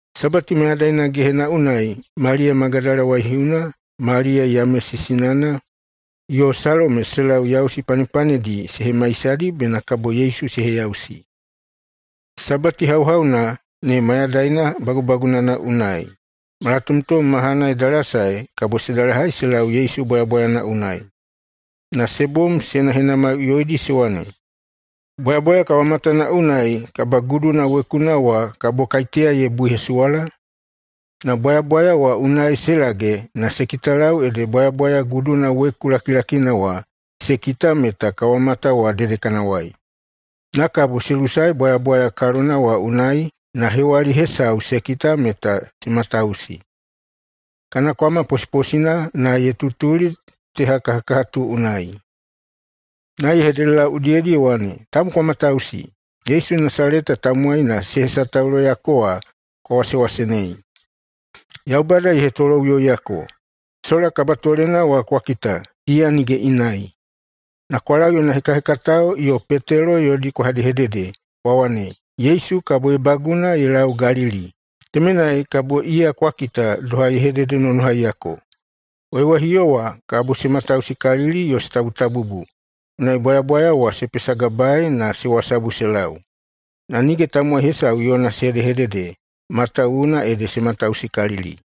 Sabati mayadaina gehena unai Maliya Magadala waihiuna, Maliya Yamesi sinana, yo Salome se lau yausi panepanedi se hemaisadi bena kabo Yesu se heyausi. Sabati hauhauna ne mayadaina bagubagunana unai, malatomtom mahana ye dalasae kabo se dalahai se lau Yesu bwayabwayana unai. Na se bom se henahenamaiꞌuyoidi se wane, “Bwayabwaya kawamatana unai kabaguduna wekuna wa kabo kaiteya ye buihesuwala?” Na bwayabwaya wa unai se lage na se kitalau ede bwayabwaya guduna weku lakilakina wa se kita meta kawamata wa dedekanawai. Na kabo se lusae bwayabwaya kalona wa unai na hewali hesau se kita, meta se matausi. Kana kwama posiposina na ye tutuli tehakahakahatu unai. Na ye hededelau udiyedi ye wane, “Tabu kwa matausi! Yesu Nasaleta tamowaina se hesatauloyako wa kwa wasewasenei. Yaubada ye hetoloꞌuyoiyako. Sola kabatolena wa kwa kita, iya nige inai. Na kwa lau yona hekahekatao yo Petelo yodi kwa hedehedede kwa wane, ‘Yesu kabo ye baguna ye lau Galili. Temenai kabo iya kwa kita doha ye hededenonohaiyako.’” Waiwaihiuwo wa se matausikalili yo se tabutabubu, unai bwayabwaya wa se pesagabae na se wasabu se lau. Na nige tamowai hesau yona se hedehedede, matawuwuna ede se matausikalili.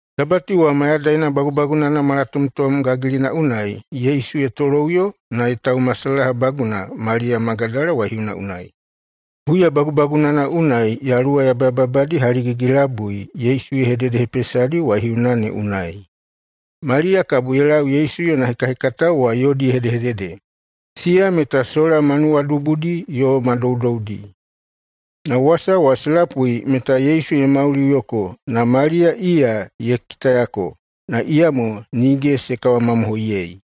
Sabati wa mayadaina bagubagunana malatomtom gagilina unai Yesu ye toloꞌuyo na ye taumasalahabaguna Maliya Magadala waihiuna unai. Huya bagubagunana unai yaluwa yabayababadi haligigi-labui Yesu ye hededehepesadi waihiuna ne unai. Maliya kabo ye lau Yesu yona hekahekatao wa yodi ye hedehedede. Siya meta sola ma nuwadubudi yo ma doudoudi. Na wasa wa se lapui meta Yesu ye mauliꞌuyoko na Maliya iya ye kitayako, na iyamo nige se kawamamohoiyei.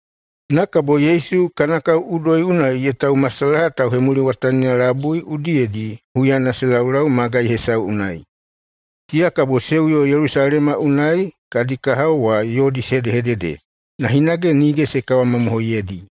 Na kabo Yesu kana kao udoi unai ye taumasalaha tauhemuliwatanina labui udiyedi huyana se laulau magai hesau unai. Siya kabo se uyo Yelusalema unai kadi kahao wa yodi se hedehedede, na hinage nige se kawamamohoiyeidi.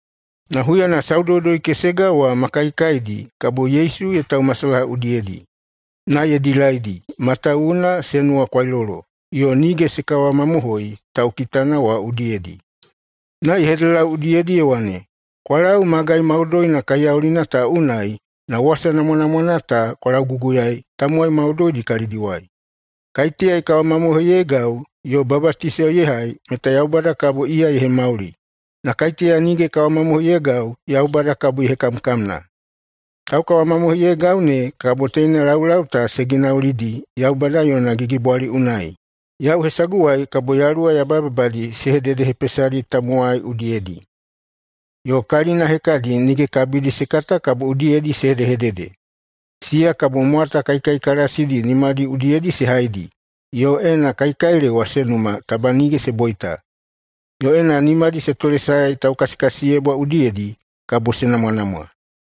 Na huyana Saudoudoi-kesega wa ma kaikaidi kabo Yesu ye taumasalaha udiyedi. Na ye dilaidi, matawuwuna se nuwakwailolo yo nige se kawamamohoi taukitana wa udiyedi. Na ye hededelau udiyedi ye wane, “Kwa lau magai maudoidi kaiyaulina ta unai na wasa namwanamwana ta kwa lauguguyaei tamowai maudoidi kalidiwai. Kaiteya ye kawamamohoiyeigau yo babatiso ye hai meta Yaubada kabo iya ye hemauli. Na kaiteya nige ye kawamamohoiyeigau, Yaubada kabo ye hekamkamna. Taukawamamohoiyeigau ne kabo teina laulau ta se ginaulidi Yaubada yona gigibwali unai: Yau hesaguwai kabo yaluwa yabayababadi se hededehepesadi tamowai udiyedi. Yo kalina hekadi nige kabidi se kata kabo udiyedi se hedehedede. Siya kabo mwata kaikaikalasidi nimadi udiyedi se haidi, yo ena kaikailewa se numa, taba nige se boita. Yo ena nimadi se tolesaedi taukasikasiyebwa udiyedi, kabo se namwanamwa.”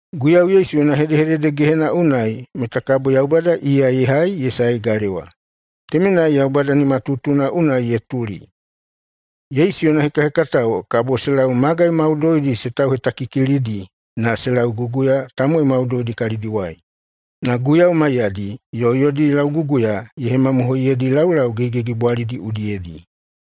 Guiyau Yesu yona hedehedede gehena unai meta kabo Yaubada iya ye hai ye saei galewa. Temenai Yaubada nimatutuna unai ye tuli. Yesu yona hekahekatao kabo se lau magai maudoidi se tauhetakikilidi na se lauguguya tamowai maudoidi kalidiwai. Na Guiyau maiyadi, yo yodi lauguguya ye hemamohoiyedi laulau gigigigibwalidi udiyedi.